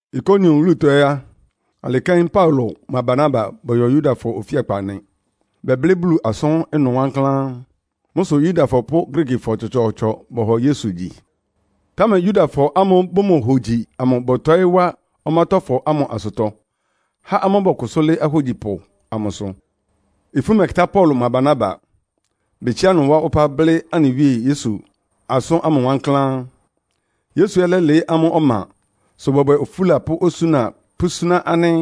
Ikonion wúlutɔ ɛ́ á, alɩ kɛ́n Paulo mʋa Barnaba bɔyɔ Yudafɔ ofíakpa nɩ. Bɛblɩ́ Bulu asʋ́n ɩnʋ wankláán. Mʋ́ sʋ Yudafɔ pʋ́ Griikifɔ tsɔtsɔɔtsɔ bɔhɔ Yesu gyi. Támɛ Yudafɔ ámʋ́ʋ́ bʋmohogyi amʋ bɔtɔɩ́ wá ɔmátɔ́fɔ ámʋ asʋtɔ, há amʋ́ bɔkʋsʋ́ lɩ́ɩ́ ahógyipʋ amʋsʋ. Ifú mɛkɩtá Paulo mʋa Barnaba. Betsiá ɩnʋ wá ɔpá blɩ́ anɩ Wíe Yesu asʋ́n ámʋ wankláán. Yesu ɛ́ lɛ́lɩɩ́ amʋ́ ɔma, sʋ bɔbwɛ ofúla pʋ́ osúna pʋ́súná ánɩ́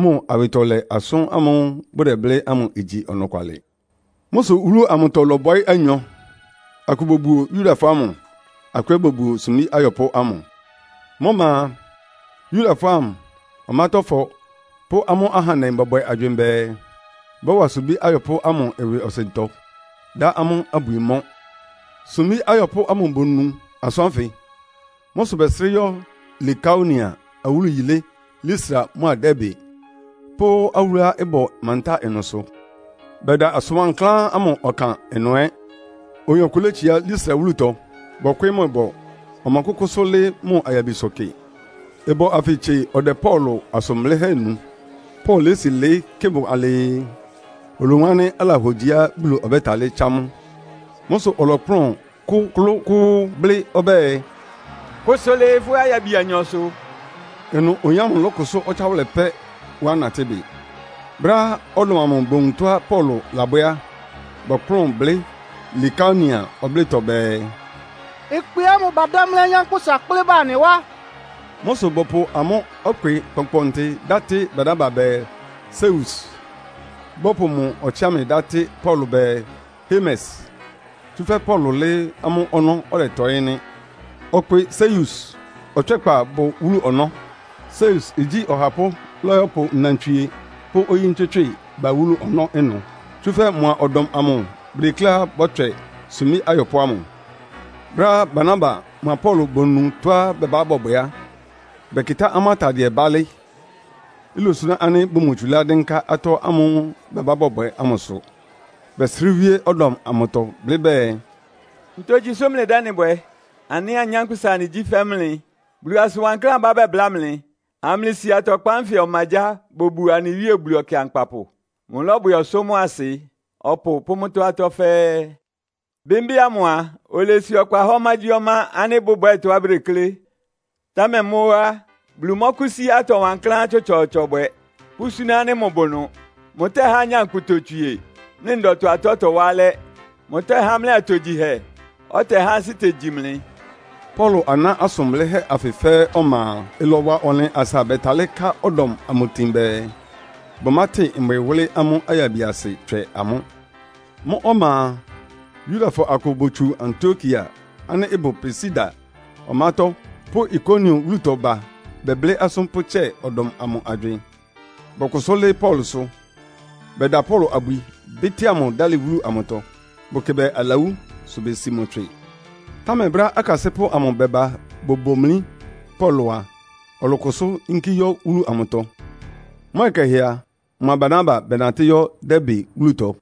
mʋ awɩtɔlɛ asʋ́n ámʋ́ʋ́ bʋdɛblɩ́ ámʋ igyi ɔnɔkwalɩ. Mʋ́ sʋ wúlu amʋtɔ ɩlɔbɔɩ́ anyɔ. Akʋ bobuo Yudafɔ ámʋ, akʋ ɛ́ bobuo sumbí ayɔpʋ́ ámʋ. Mʋ́ ɔma a, Yudafɔ, ɔmátɔ́fɔ pʋ́ amʋ́ ahandɛ bɔbwɛ agywɩɩn bɛɛ, bɔ́wa sumbí ayɔpʋ́ ámʋ ɩwɩɔsɩntɔ, dá amʋ́ abwi mɔ́. Sumbí ayɔpʋ́ ámʋ bonu asʋ́n ánfɩ. Mʋ́ sʋ bɛsrɩ́ yɔ́ Likaonia awúlu yilé Listra mʋ́a Derbe pʋ́ awúluá ɩbʋ mantáa ɩnʋsʋ. Bɛda asʋn wankláán ámʋ ɔkan ɩnʋ ɛ́. Oyin ɔkʋ létsiá Listra wúlutɔ, bɔkwɩɩ́ mʋ ɩbɔ. Ɔmɔkʋ́kʋ́sʋ́ lɩ́ɩ́ mʋ ayabisʋ kɩ. Ɩbɔ anfɩ tsie ɔdɛ Paulo asʋn blɩ́hɛ́ nu. Paulo lési lɩɩ́ kɩ mʋ alɩɩ, olowun ánɩ́ alahogyiá Bulu ɔbɛ́talɩ́ tsá mʋ. Mʋ́ sʋ ɔlɔkplʋ́n kʋklʋ́kʋ́ʋ́ blɩ́ ɔbɛ́ɛ, “Kʋsʋ lɩɩ fʋ́ ayabi anyɔsʋ.” Ɩnʋ oyin ámʋ lɔ́kʋsʋ́ ɔtsáwʋlɛ pɛ́, wá natɩ́ bɩ. Brɛ́á ɔdɔm amʋ bowun tɔ́á Paulo labwɛ́ á, bɔkplʋ́n blɩ́ Likaonia ɔblɩ́tɔ bɛɛ, “Ɩkpɩ ámʋ badámlí anyánkpʋ́sa kplɩ́ ba anɩ wá.” Mʋ́ sʋ bɔpʋ amʋ́ ɔkpɩ kpɔnkpɔntɩ dá tɩ́ Barnaba bɛɛ, “Seus.” Bɔpʋ mʋ ɔtsɩámɩ dá tɩ́ Paulo bɛɛ, “Hermes,” tsúfɛ́ Paulo lɩ́ɩ́ amʋ́ ɔnɔ́, ɔdɛtɔɩ́ nɩ́. Ɔkpɩ Seus ɔtswɛ́kpa bʋ wúlu ɔnɔ́. Seus igyí ɔhapʋ́ lɔ́yɔ́pʋ nnantswie pʋ́ oyí ntswɩ́tswɩ́ɩ ba wúlu ɔnɔ́ ɩnʋ. Tsúfɛ́ mʋa ɔdɔm amʋ bʋdekléá bɔ́tswɛ sumbí ayɔpʋ́ ámʋ. Brɛ́á Barnaba mʋa Paulo bonu tɔ́á bɛbá bɔbwɛ á, bɛkɩtá amʋ́ atadɩɛ bálɩ́. Ilosuná ánɩ́ bʋmotsulá dɩ́nká ɩtɔ́ ámʋ́ʋ́ bɛbá bɔbwɛ ámʋsʋ. Bɛsrɩ́ wíé ɔdɔm amʋtɔ blɩ́ bɛɛ, “Ntogyi mlɩdɛ́ ɩ́nɩ bwɛ? Anɩ ɛ́ anyánkpʋ́sa anɩgyí fɛ́ mlɩ. Bulu asʋn wankláán abá bɛbláa mlɩ, amlɩsi atɔkpan ánfɩ ɔmagyáa bobuo anɩ Wíe Bulu Ɔkɩankpapʋ. Mʋlɔ́bwɛ ɔsʋ́ mʋ́a asɩ, ɔpʋ pʋ́ mʋ́tɔ́ atɔ́ fɛ́ɛ́. Bɩ́mbɩ́ ámʋ a, olesi ɔkpa há ɔmágyíɔmá ánɩ́ bʋbwɛ́ɛ tɔ́á bʋdeklé. Támɛ mʋ́ ó á, Bulu mɔ́kʋ́sí atɔ wankláán tsɔtsɔɔtsɔ bwɛ, pʋ́súná ánɩ́ mʋbʋ ɩnʋ. Mʋtɛ́há nyankpʋ totswie, mlɩ ndɔtɔ atɔ́ tɔwá alɛ́. Mʋtɛ́há mlɩ atogyihɛ, ɔtɛhá ansɩ́ tegyi mlɩ.” Paulo aná asʋn blɩ́hɛ́ anfɩ fɛ́ɛ́ ɔma a, ɩlɔwa ɔnlɩn asa bɛtalɩ́ ká ɔdɔm amʋ tin bɛɛ, bʋmátɩn mbwɩ wʋ́lɩ́ amʋ́ ayabiasɩ tswɛ amʋ́. Mʋ́ ɔma a, Yudafɔ akʋ botsu Antiokia ánɩ́ ɩbʋ Pisidia ɔmátɔ́ pʋ́ Ikonion wúlutɔ ba bɛblɩ́ asʋ́n pʋ́tsɛ ɔdɔm amʋ agywɩɩn, bɔkʋsʋ́ lɩ́ɩ́ Paulosʋ. Bɛda Paulo abwi, bɩ́tɩ́a mʋ dálɩ wúlu amʋtɔ. Bʋkɩ bɛɛ alawú, sʋ besi mʋ tswɩ. Támɛ brɛ́á akasɩ́pʋ́ amʋ bɛba bobomlí Paulo a, ɔlɔkʋsʋ́ yínkí yɔ́ wúlu amʋtɔ. Mʋ́ ɔyɩ kɛhɛ a, mʋa Barnaba bɛnatɩ́ yɔ́ Derbe wúlutɔ.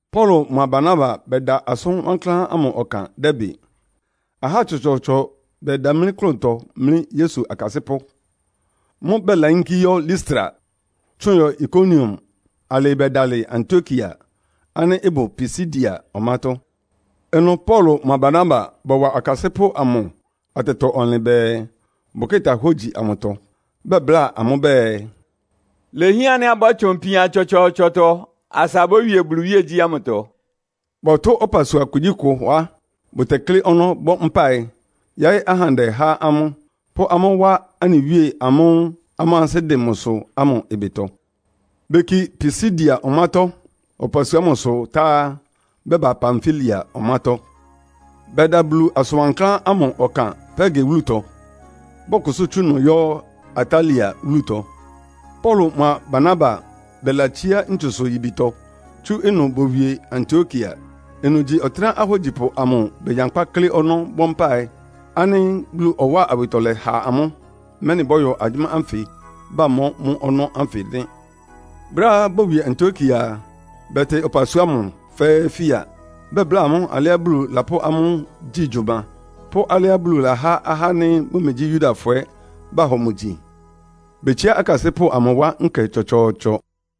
Paulo mʋa Barnaba bɛda asʋn wankláán ámʋ ɔkan Derbe. Ahá tsɔtsɔɔtsɔ bɛdamlí klʋntɔ mlí Yesu akasɩ́pʋ́. Mʋ́ʋ́ bɛlayínkí yɔ́ Listra, tsʋn yɔ Ikonion alɩɩ bɛbɛdalɩ Antiokia ánɩ́ ɩbʋ Pisidia ɔmátɔ́. Ɩnʋ Paulo mʋa Barnaba bɔwa akasɩ́pʋ́ amʋ atɛtɔ-ɔnlɩn bɛɛ, bʋkɩ́ta hógyi amʋtɔ. Bɛbláa amʋ́ bɛɛ, “Ilehián ánɩ́ abɔ́tsʋn ipian tsɔtsɔɔtsɔtɔ asa abówie Bulu iwíegyí ámʋtɔ.” Bɔtʋ́ ɔpasua kugyíkʋ á, bʋtɛklɩ́ ɔnɔ́ bɔ́ mpáɩ, yáɩ́ ahandɛ há amʋ́, pʋ́ amʋ́ wá anɩ Wíe amʋ́ʋ́ amʋ́ ansɩ́ dɩn mʋsʋ ámʋ ɩbɩtɔ. Beki Pisidia ɔmátɔ́ ɔpasua ámʋsʋ tá á, bɛba Pamfilia ɔmátɔ́. Bɛda Bulu asʋn wankláán ámʋ ɔkan Perge wúlutɔ. Bɔkʋsʋ́ tsú ɩnʋ yɔ́ Atalia wúlutɔ. Paulo mʋa Barnaba bɛlatsíá ntsusʋ-yibitɔ tsú ɩnʋ bowie Antiokia. Ɩnʋ gyí ɔtɩ́nɛ́á ahógyipʋ amʋ begyankpá klɩ́ ɔnɔ́ bɔ́ mpáɩ, ánɩ́ Bulu ɔwáa awɩtɔlɛ ha amʋ́, mɛ́nɩ bɔ́yɔ agyʋ́má ánfɩ bamɔ́ mʋ́ ɔnɔ́ ánfɩ nɩ́. Brɛ́á bowie Antiokia a, bɛtɩ ɔpasua ámʋ fɛ́ɛ́ fia. Bɛbláa amʋ́ alɩá Bulu lapʋ́ amʋ́ gyi gyʋma, pʋ́ alɩá Bulu lahá ahá ánɩ́ bʋmegyí Yudafɔ ɛ́ bahɔ mʋ gyi. Betsiá akasɩ́pʋ́ amʋ wá nkɛ tsɔtsɔɔtsɔ.